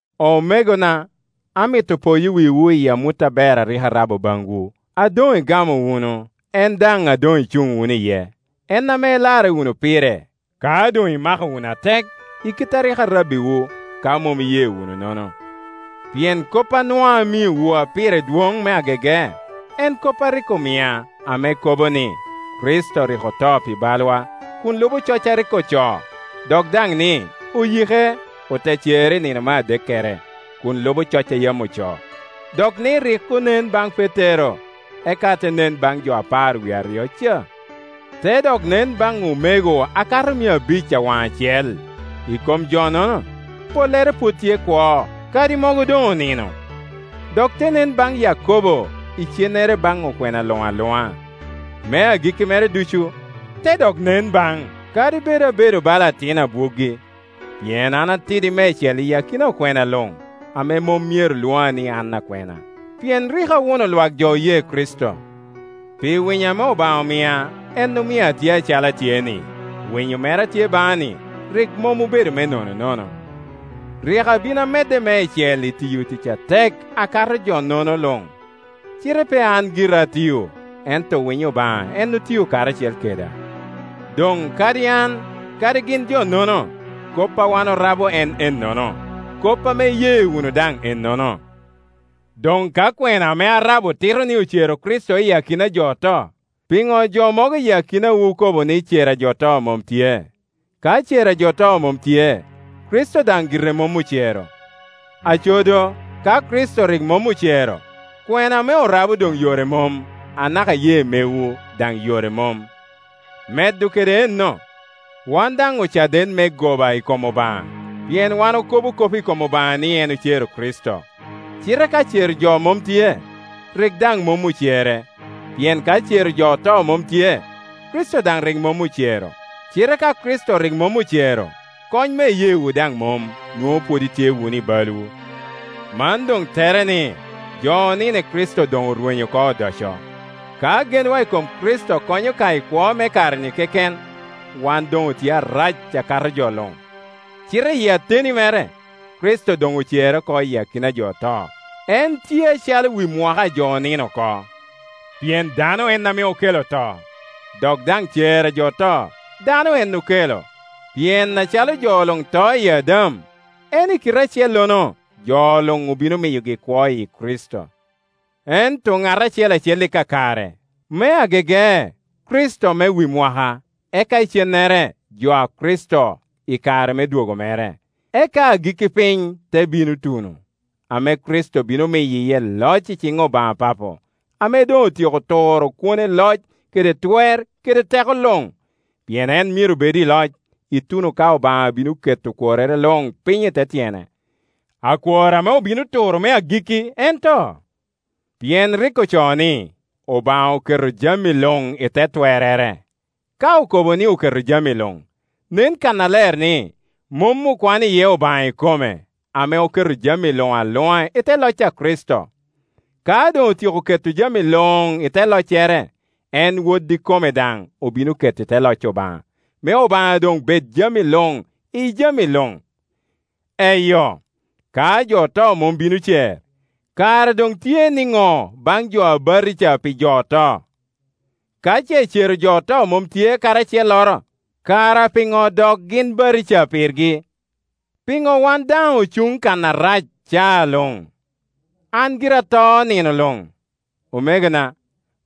Omegona, amito poyo wiwu i amut aber a rik arabo baŋwu, a doŋ igamo wunu, en daŋ a doŋ icuŋ wunu iye; en ame ilarre wunu pire, ka doŋ imako wunu atek i kit a rik arabbiwu, ka mom iye wunu nono. Pien kop a nwaŋ amiowu a pire dwoŋ me agege, en kop a rik omia, ame kobo ni, Kricito rik oto pi balwa, kun lubo coc a rik ocoo; dok daŋ ni oyike, ote cere i nino me adekkere, kun lubo coc a yam ocoo, dok ni rik onen baŋ Petero, eka te nen baŋ jo apar wie aryo ca. Te dok nen baŋ omego a kato mia abic awaŋacel; i kom jo-nono pollere pwod tye kwo, kadi mogo doŋ onino. Dok te nen baŋ Yakobo, icennere baŋ okwena luŋ aluŋa. Me agikki mere ducu, te daŋ nen baŋ, kadi bed abedo bala atin abwoggi. Pien an atidi meicel i akina okwena luŋ, ame mom myero lwoŋa ni an akwena, pien rik awuno lwak jo oye Kricito. Pi winyo ame Obaŋa omia en omio atye acalo atye-ni; winyo mere a tye baŋa-ni rik mom obedo me nononono. Rik abin amedde meicel i tiyo tic atek akato jo-nono luŋ; cite pe an gira atio, ento winyo Obaŋa en otio karacel keda. Doŋ kadi an kadi gin jo-nono, kop a wan orabo en ennono, kop ame iye wunu daŋ ennono. Doŋ ka kwena ame arabo tito ni ocero Kricito iyi akina a jo oto, piŋo jo mogo i akinawu okobo ni cer a jo oto mom tye. Ka cer a jo oto mom tye, Kricito daŋ gire mom ocero. Aco do, ka Kricito rik mom ocero, kwena ame orabo doŋ yore mom. Anaka iyee megwu daŋ yore mom. Medo kede enno, wan daŋ ocaden me goba i kom Obaŋa, pien wan okobo kop i kom Obaŋa ni en ocero Kricito, cite ka cero jo mom tye, rik daŋ mom ocere. Pien ka cero jo oto mom tye, Kricito daŋ rik mom ocero. Cite ka Kricito rik mom ocero, kony me iyeewu daŋ mom, nwoŋo pwod itye wunu i balwu. Man doŋ tere ni jo onino i Kricito doŋ orwenyo oko odoco. Ka genwa i kom Kricito konyo ka i kwo me kare-ni keken, wan doŋ otye arac akato jo luŋ. Cite iyi ateni mere, Kricito doŋ ocere oko iyi akina a jo oto, en tye acalo wi mwaka a jo onino oko. Pien dano en ame okelo to, dok daŋ cer a jo oto dano en ame okelo. Pien acalo jo luŋ to iyi Adam, en i kite acellono jo luŋ obino miyogi kwo iyi Kricito. Ento ŋat acel acel i kakare: me agege Kricito, me wi mwaka, eka icennere jo a Kricito i kare me dwogo mere. Eka agikki piny te bino tuno, ame Kricito bino miyo iye loc iciŋ Obaŋa Papo, ame doŋ otyeko turo kwone loc kede twer kede teko luŋ. Pien en myero bed i loc, ituno ka Obaŋa bino keto okworrere luŋ piny i te tyene. Akwor ame obino turo me agikki en to. Pien rik ocoo ni, “Obaŋa oketo jami luŋ i te twerrere.” Ka okobo ni “oketo jami luŋ,” nen kannaler ni mom okwano iye Obaŋa ikome, ame oketo jami luŋ aluŋa i te loc a Kricito. Ka doŋotyeko keto jami luŋ i te loccere, en Wod ikome daŋ obino keto i te loc Obaŋa, me Obaŋa doŋ bed jami luŋ iyi jami luŋ. Eyo, ka jo oto mom bino cer, kara doŋ tye niŋo baŋ jo a batija pi jo oto? Ka ce cero jo oto mom tye kadi acelloro, kara piŋo dok gin batija pirgi? Piŋo wan daŋ ocuŋ kan arac caa luŋ? An gira ato nino luŋ, omegona;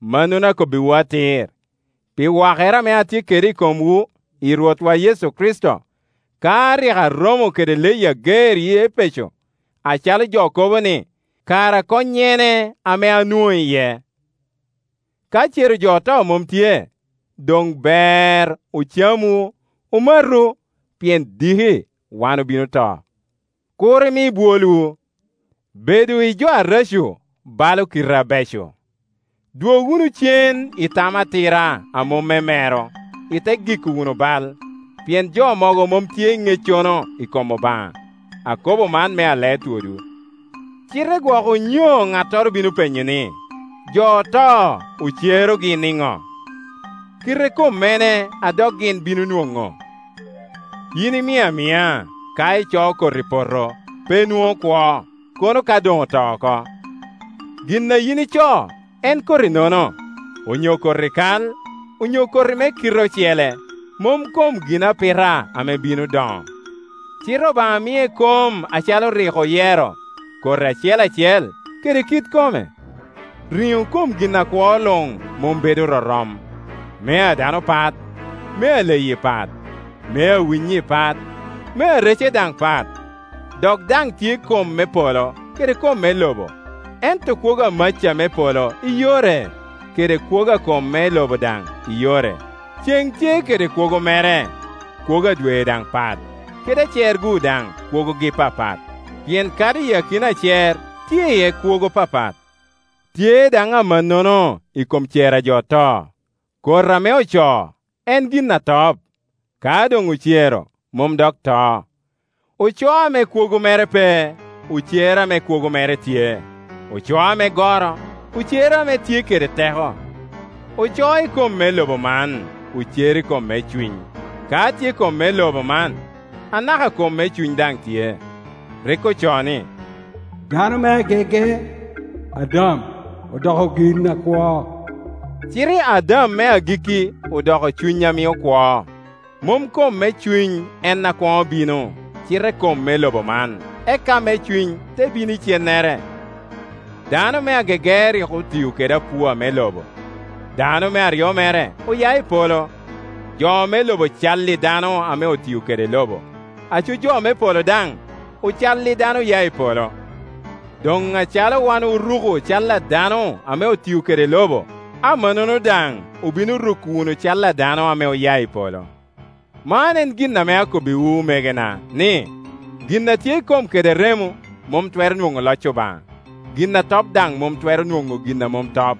mannono akobbiwu atir, pi wakere ame atye kede i komwu i Rwotwa Yecu Kricito. Ka rik aromo kede leyi ager i Epeco, acalo jo kobe-ni, kara konnyene ame anwoŋo iye? Ka cero jo oto mom tye, doŋ ber “ocamu, omatu, pien diki wan obino to.” Kur imi bwolwu: “Bedo i jo areco balo kite abeco.” Dwog wunu cen i tam atira a mom me mero, ite giko wunu bal. Pien jo mogo mom tye i ŋeccono i kom Obaŋa. Akobo man me alee twodwu. Cite gwok onyo ŋattoro bino penyo ni, “Jo oto ocerogi niŋo? Kite kommene a dok gin bino nwoŋo?” Yin imiŋ amiŋa! Ka icoo koti i poto, pe nwoŋo kwo, kono ka koŋ oto oko. Gin a yin icoo en koti nono, onyo koti kal onyo koti me kite ocele, mom kom ginapita ame bino doŋo. Cite Obaŋa mie kom acalo rik oyero, koti acel acel kede kit kome. Riŋo kom gin akwo luŋ mom bedo rorom; mea dano pat, mea leyi pat, mea winyi pat, mea rece daŋ pat. Dok daŋ tye kom me polo kede kom me lobo; ento kwogo a maca me polo i yore, kede kwogo a kom me lobo daŋ i yore. Cen tye kede kwogo mere, kwogo a dwe daŋ pat, kede acer-gu daŋ kwogogi papat; pien kadi i akina acer tye iye kwogo papat. Tye daŋ amannono i kom cer a jo oto. Koti ame ocoo en gin atop; ka doŋ ocero mom dok to. Ocoo ame kwogo mere pe, ocero ame kwogo mere tye; ocoo ame goro, ocero ame tye kede teko. Ocoo i kom me lobo man, ocero i kom me cuny. Ka tye kom me lobo man, anaka kom me cuny daŋ tye. Rik ocoo ni, “Dano me agege, Adam, odoko gin akwo”; cite Adam me agikki odoko cuny a mio kwo. Mom kom me cuny en a kwoŋo bino, cite kom me lobo man; eka me cuny te bino icennere. Dano me agege rik otio kede apua me Iobo; dano me aryo mere oya i polo. Jo me lobo cal i dano ame otio kede lobo; aco jo me polo daŋ ocal i dano oya i polo. Doŋ acalo wan oruko cal a dano ame otio kede lobo, amannono daŋ obino ruko wunu cal a dano ame oya i polo. Man en gin ame akobbiwu, omegona, ni, gin a tye i kom kede remo mom twero nwoŋo loc Obaŋa, gin a top daŋ mom twero nwoŋo gin a mom top.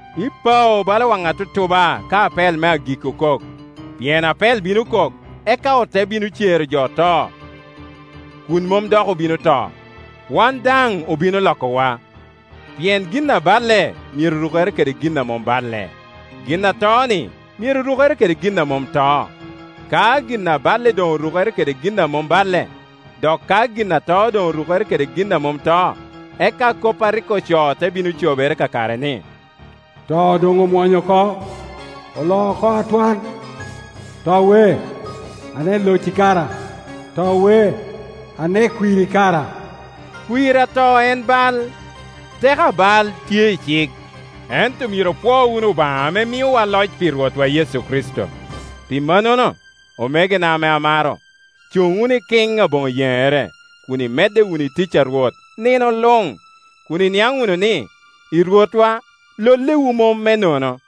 ipao, bala waŋ atutuba, ka apel me agikki okok. Pien apel bino kok, eka ote bino cero jo oto kun mom dok obino to, wan daŋ obino lokowa. Pien gin abaile myero rukere kede gin a mom balle, gin a to-ni myero rukere kede gin a mom to. Ka gin a baile doŋ orukere kede gin a mom baile, dok ka gin a to doŋorukere kede gin a mom to, eka kop a rik ocoo te bino cobere kakare, ni, “To doŋ omwonyo oko, oloo oko atwal.” “To we, ane locci kara? To we, ane kwirri kara?” Kwir a to en bal, teko a bal tye i cik. Ento myero opwoo wunu Obaŋa ame miowa loc pi Rwotwa Yecu Kricito. Pi mannono, omegona ame amaro, cuŋ wunu ikiŋ aboŋo yeŋere, kun imedde wunu i tic a Rwot nino luŋ, kun iniaŋ wunu ni, i Rwotwa lollewu mom me nono.